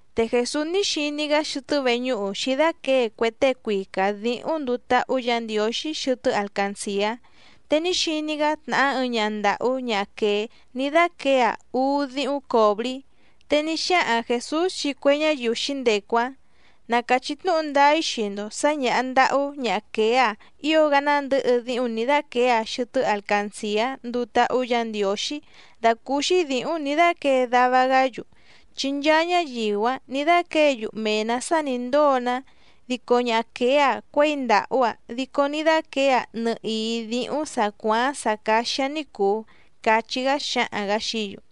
Te Jèsús ní xiní‑gá xɨtɨ́ veñúhu xǐdáquěe cue tée cuica dǐhúⁿ nduu táhú Yǎ Ndiǒxí xɨtɨ́ alcancìá. Te ní xiní‑gá tnàhá ɨɨⁿ ñaha ndàhú ñaha quèé ní dáquěe‑aⁿ úú díhúⁿ còbrí, te ní xáhaⁿ Jèsús xii cue ñáyiu xǐndecu‑áⁿ: —Na càchí tnúhu ndáá‑í xii‑ndo sǎ ñàha ndahú ñaha quèé‑a ío‑gá nándɨ̌hɨ díhúⁿ nǐ dáquěe‑aⁿ xɨtɨ́ alcancìá nduu táhú Yǎ Ndiǒxí dàcúúxí dǐhúⁿ nǐ dáquěe dava‑gá‑yu. Chi nchaa ñáyiu‑áⁿ nǐ dáquěe‑yu mee‑nǎ sá nǐ ndóo‑ná, dico ñaha quèé‑a cuěi ndàhú‑aⁿ dico ní dáquěe‑aⁿ nɨhìí díhúⁿ sǎ cuááⁿ‑áⁿ sǎ cáxí‑áⁿ ní cùu —cachí‑gá xáhaⁿ‑gǎ xií‑yu.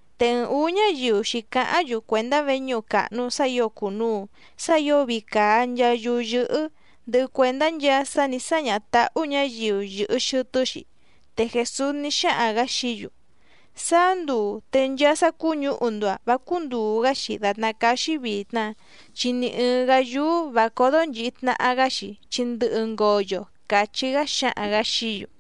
Te ɨɨⁿ ǔú ñáyiu xǐcáháⁿ‑yu cuèndá veñúhu càhnu sá ǐo cùnuu sá ǐo vii càa nchaa yúú yɨ́hɨ́, ndɨhɨ cuèndá nchaa sá nǐ sáñaha tǎhú ñǎyiu yɨ̀hɨ xɨtɨ́‑xi. Te Jèsús ní xáhaⁿ‑gǎ xií‑yu: —Sáá nduu te nchaa sá cúñǔhu‑ndo‑a vǎ cúndùu‑gá‑xi dàtná cáá‑xí vìtna, chi ni ɨ̀ɨⁿ‑gá yúú vǎ códó nchìhi tnaha‑gá‑xi chi ndɨhɨ ngoyo —càchí‑gá xáhaⁿ‑gǎ xií‑yu.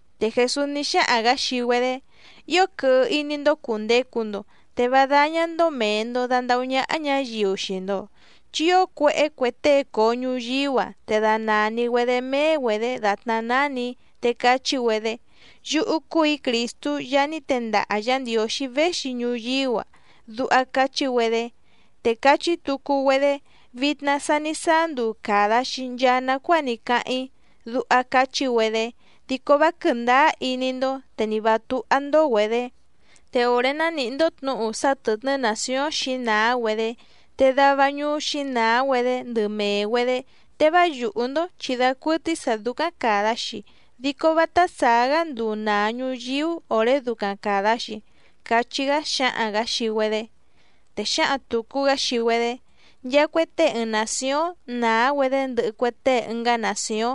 Te Jèsús ní xáhaⁿ‑gǎ xii‑güedé: —Ío quɨhɨ iní‑ndó cùndecu‑ndo, te vá dáñá‑ndó mèe‑ndo dandahú ñáhá ñǎyiu xii‑ndo. Chi ío cuéhé cue tée coo ñuyíú‑a, te danàni‑güedé méé‑güedě dàtná nánì‑í te cachí‑güedé: “Yúhú cúù‑í Crìstú Yaá ní tendaha Yǎ Ndiǒxí véxi ñuyíú‑a”, duha cachí‑güedé. Te cachí tucu‑güedé: “Vitna sa ní sáá nduu càda‑xi nchaa nacuáa ní cáháⁿ‑í”, duha cachí‑güedé. Dico vá quɨ̀ndáá iní‑ndó, te nì vá túhá‑ndó‑güedě. Te òré ná nìhí‑ndó tnǔhu sá tɨ̀tnɨ́ nàcióⁿ xǐnàá‑güedé te dava ñuú xǐnàá‑güedé ndɨ mèe‑güedé, te vá yùhú‑ndó chi dacuɨtɨ́í sǎ dúcáⁿ càda‑xi, dico vátá sàá‑gá nduu nàa ñuyíú òré ducaⁿ càda‑xi —cachí‑gá xáhaⁿ‑gǎ xii‑güedé. Te xǎhaⁿ tùcu‑gá xii‑güedé: —Nchaa cue tée ɨɨⁿ nàcióⁿ nàá‑güedé ndɨhɨ cue tée ɨngá nàcióⁿ,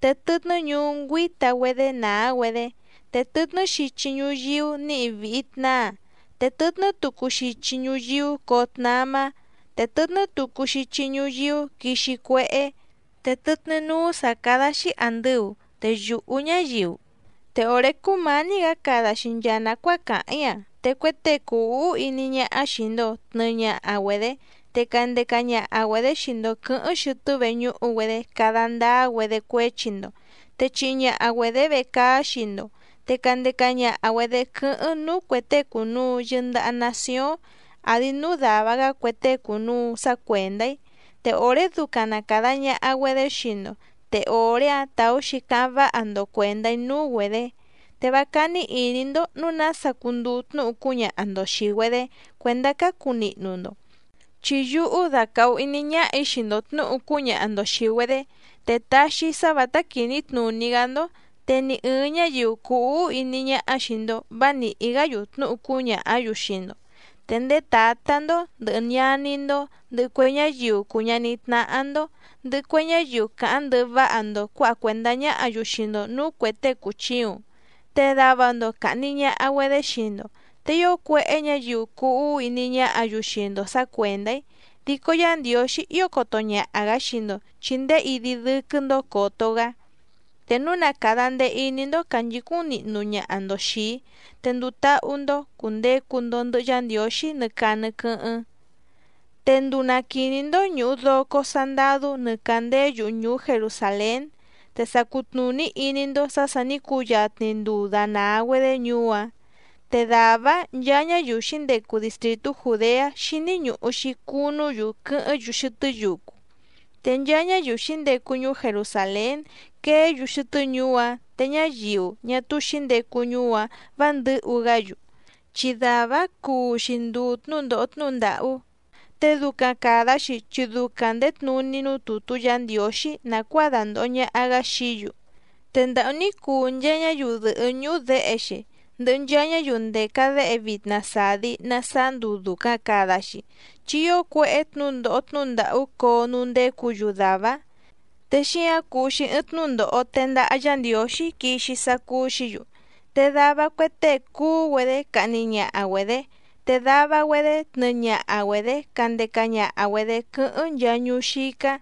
te tɨtnɨ́ ñuú ngüíta‑güedé nàá‑güedé. Te tɨtnɨ́ xichi ñuyíú nǐhi vìhi tnáa, te tɨtnɨ́ tucu xichi ñuyíú coo tnamá, te tɨtnɨ́ tucu xichi ñuyíú quixi cuéhé, te tɨtnɨ́ núú sǎ cádá‑xí àndɨu, te yùhú ñáyiu. ’Te òré cúmǎní‑gǎ cada‑xi nchaa nàcuáa càháⁿ‑í‑a, te cue tée cùu úhú iní ñáhá xìi‑ndo tnɨɨ ñaha‑güedé, te candeca ñaha‑güedě xii‑ndo quɨ̌hɨ́ⁿ xɨtɨ́ veñúhu‑güedé cada ndáá‑güedé cuéchi‑ndo, te chihi ñaha‑güedě vecaá xii‑ndo, te candeca ñaha‑güedě quɨ́hɨ́ⁿ núú cuè tée cùnuu yɨndaha nacióⁿ àdi núú dàva‑gá cue tée cùnuu sá cuèndá‑í. Te òré ducaⁿ na càda ñaha‑güedé xii‑ndo, te òré‑áⁿ tàú‑xi cáháⁿ váha‑ndo cuèndá‑í núú‑güedě. Te vá cání ìní‑ndó nǔu nása cunduu tnúhu cúñaha‑ndo xìi‑güedé cuèndá cácu nihnu‑ndo. Chi yúhú dacàhu iní ñáhà‑í xii‑ndo tnǔhu cúñaha‑ndo xìi‑güedé, te taxi‑í sá vǎtá quìní tnùní‑gá‑ndó, te ni ɨ̀ɨⁿ ñáyiu cùu úhú iní ñáhá xìi‑ndo vá nìhí‑gá‑yu tnúhu cúñàhá‑yu xii‑ndo. Te ndéé tǎtá‑ndó, ndɨ̀hɨ ñaní‑ndó, ndɨhɨ cue ñáyiu cùu ñaní tnáhá‑ndó, ndɨhɨ cue ñáyiu càháⁿ ndɨhɨ váha‑ndo cuǎha cuèndá ñáhǎ‑yu xii‑ndo nǔú cuè tée cùchiuⁿ, te dava‑ndo càhni ñaha‑güedé xii‑ndo. Te ío cuéhé ñǎyiu cuu úhú iní ñáhǎ‑yu xii‑ndo sǎ cuèndá‑í. Dico Yá Ndiǒxí ío coto ñaha‑gǎ xii‑ndo chi ndéé idi dɨ́quɨ́‑ndó còto‑gá. Te núu na càda ndee iní‑ndó cànchicúⁿ nihnu ñaha‑ndo xìi‑í, te nduu táhú‑ndó cùndecu‑ndo ndɨhɨ Yá Ndiǒxí nɨ caa nɨ quɨ́hɨ́ⁿ. ’Te nduu na quìní‑ndó ñùhu doco sandadú nɨ càndéé yuhu ñùú Jerusàlén, te sa cutnùní iní‑ndó sǎ sà ní cuyatni nduu dànaa‑güedé ñuú‑áⁿ. Te dàvá‑áⁿ nchaa ñáyiu xǐndecu distrìtú Jùdeá xíní ñùhu‑xi cunú‑yu quɨ́hɨ́ⁿ‑yu xɨtɨ́ yucu, te nchaa ñáyiu xǐndecu ñuú Jerusàlén queé‑yu xɨtɨ́ ñuú‑áⁿ, te ñáyiu ñá túú xǐndecu ñuú‑áⁿ vǎ ndɨ̌hu‑gá‑yu. Chi dàvá‑áⁿ cuu‑xi nduu tnǔndòho tnúhu ndàhú, te ducaⁿ càda‑xi chi ducaⁿ ndèé tnuní núú tùtú Yǎ Ndiǒxí nàcuáa dandòho ñaha‑gá xií‑yu. ¡Te ndàhú ní cuu nchaa ñáyiu dɨ̀hɨ́ ñúhú děhe‑xi, ndɨhɨ nchaa ñáyiu ndèca déhe vitna sàdi na sáá nduu dùcaⁿ cada‑xi! Chi ío cuéhé tnǔndòho tnúhu ndàhú coo núú ndécǔ‑yu dàvá‑áⁿ, te xíǎⁿ cuu‑xi ɨɨⁿ tnúndòho tendaha Yá Ndiǒxí quixi sá cúú‑xǐ‑yu. Te dava cue tée cuú‑güedé cahni ñaha‑güedě, te dava‑güedé tnɨɨ ñaha‑güedě candeca ñaha‑güedě quɨ́hɨ́ⁿ nchaa ñuú xícá,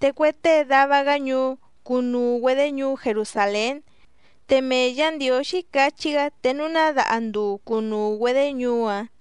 te cue tée dava‑gá ñuú cunuu‑güedě ñuú Jerusàlén, te mee Yǎ Ndiǒxí cachí‑gá te núu ná daha nduu cunuu‑güedě ñuú‑áⁿ.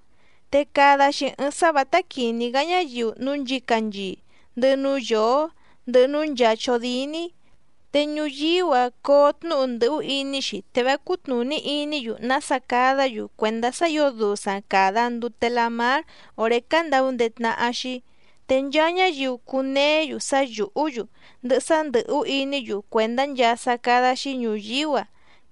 ’Te cada‑xi ɨɨⁿ sá vǎtá quìní‑gá ñáyiu núú nchǐcanchii, ndɨhɨ núú yǒó, ndɨhɨ núú nchàa chódíní, te ñuyíú‑a coo tnúhu ndɨ̀hú iní‑xi te vá cútnùní iní‑yu nása cadá‑yu cuèndá sá ǐo dusaⁿ càda ndute lamár òré candaundéé tnáhá‑xí. Te nchaa ñáyiu cuneé‑yu sá yùhú‑yu, ndɨhɨ sá ndɨ̀hú iní‑yu cuèndá nchaa sá cádá‑xí ñùyíú‑a,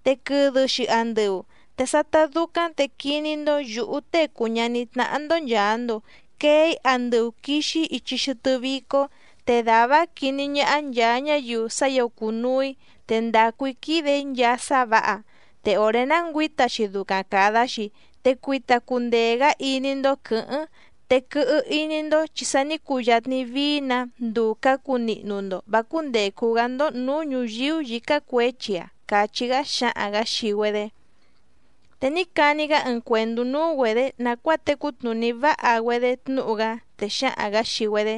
te quɨdɨ‑xi andɨu. Te sátá dúcáⁿ te quiní‑ndó yǔhú Tée cùu ñaní tnáhá‑ndó nchàa‑ndo quee‑í andɨu quìxi‑í ichi xɨtɨ́ vícó, te dàvá‑áⁿ quiní ñáhá nchàa ñáyiu sá ǐo cùnuu‑í te ndàcu‑í quìde‑í nchaa sá vǎha. Te òré ná ngüǐta‑xi ducaⁿ càda‑xi, te cuita cundee‑gǎ iní‑ndó quɨ̌hɨ́ⁿ, te quɨhɨ iní‑ndó chi sa ní cuyatni vií‑nǎ nduu cǎcu nihnu‑ndo vǎ cúndècu‑gá‑ndó nǔú ñùyíú yǐcá cuěchi‑a —càchí‑gá xáhaⁿ‑gǎ xii‑güedé. Te ní cani‑gá ɨɨⁿ cuèndú núú‑güedě nàcuáa tecú tnùní váha‑güedé tnúhu‑gá, te xáhaⁿ‑gǎ xii‑güedé: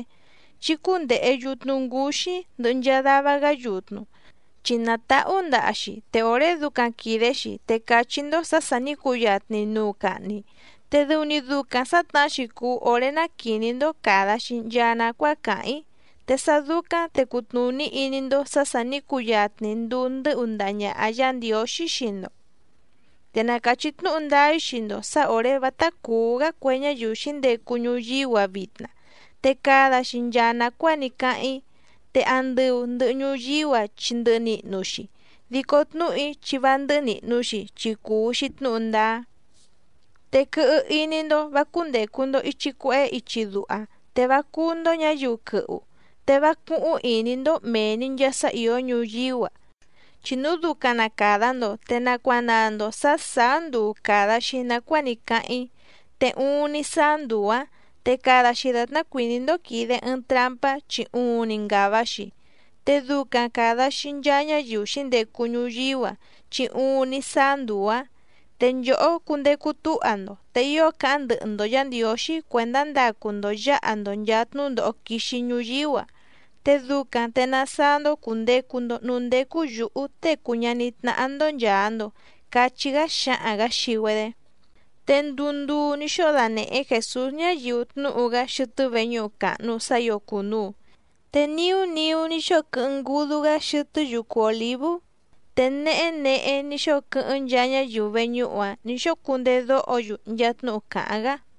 —Chí cúndèhe yutnu ngúxí ndɨhɨ nchaa dava‑gá yutnu. Chi nàtahú ndaha‑xi, te òré ducaⁿ quìde‑xi te càchí‑ndó sǎ sà ní cuyatni nuu cahni. Te dɨu‑ni ducaⁿ sǎtnahá‑xi cùu oré ná quìní‑ndó càda‑xi nchaa nacuáa càháⁿ‑í, te sá dúcáⁿ te cutnùní iní‑ndó sǎ sà ní cuyatni nduu ndɨ́hu ndaha ñàha Yá Ndiǒxí xii‑ndo. ’Te na càchí tnúhu ndáá‑í xii‑ndo sǎ òré vátá cùú‑gá cue ñáyiu xǐndecu ñuyíú‑a vitna, te cada‑xi nchaa nàcuáa ní cáháⁿ‑í. Te andɨu ndɨ̀hɨ ñuyíú‑a chi ndɨhɨ nihnu‑xi, dico tnúhu‑í chi vá ndɨ́hɨ́ nìhnu‑xi, chi cùu‑xi tnúhu ndáá. ’Te quɨhɨ iní‑ndó vǎ cúndècu‑ndo ichi cuehé ichi duha, te vá cúú‑ndó ñǎyiu quɨhu, te vá cúhúⁿ ìní‑ndó mèe‑ni nchaa sá ìó ñuyíú‑a, chi núu ducaⁿ na càda‑ndo te nacuanaa‑ndo sǎ sàá nduu càda‑xi nacuáa ní cáháⁿ‑í. Te uuⁿni sáá nduu‑ǎⁿ, te cada‑xi dàtná cuìní‑ndó quìde ɨɨⁿ trampá chi uuⁿni ngàva‑xi, te ducaⁿ càda‑xi nchaa ñáyiu xǐndecu ñuyíú‑a, chi uuⁿni sáá nduu‑ǎⁿ. Te nchòhó cundecu túha‑ndo te ío cáháⁿ ndɨhɨ‑ndo Yǎ Ndiǒxí cuèndá ndacu‑ndo yǎha‑ndo nchàa tnúndòho quixi ñuyíú‑a, te ducaⁿ te nasáá‑ndó cùndecu‑ndo núú ndécú yǔhú Tée cùu ñaní tnáhá‑ndó nchàa‑ndo —cachí‑gá xáhaⁿ‑gǎ xii‑güedé. Te nduu ndùu ní xóo danèhé Jèsús ñáyiu tnúhu‑gá xɨtɨ́ veñúhu càhnu sá ǐo cùnuu, te niú niú ní xóo quɨ́hɨ́ⁿ ngúdú‑gá xɨtɨ́ yucu Òlívú. Te nehé nehé ní xóo quɨ́hɨ́ⁿ nchaa ñáyiu veñúhu‑áⁿ nǐ xóo cundedóho‑yu nchaa tnúhu càháⁿ‑gá.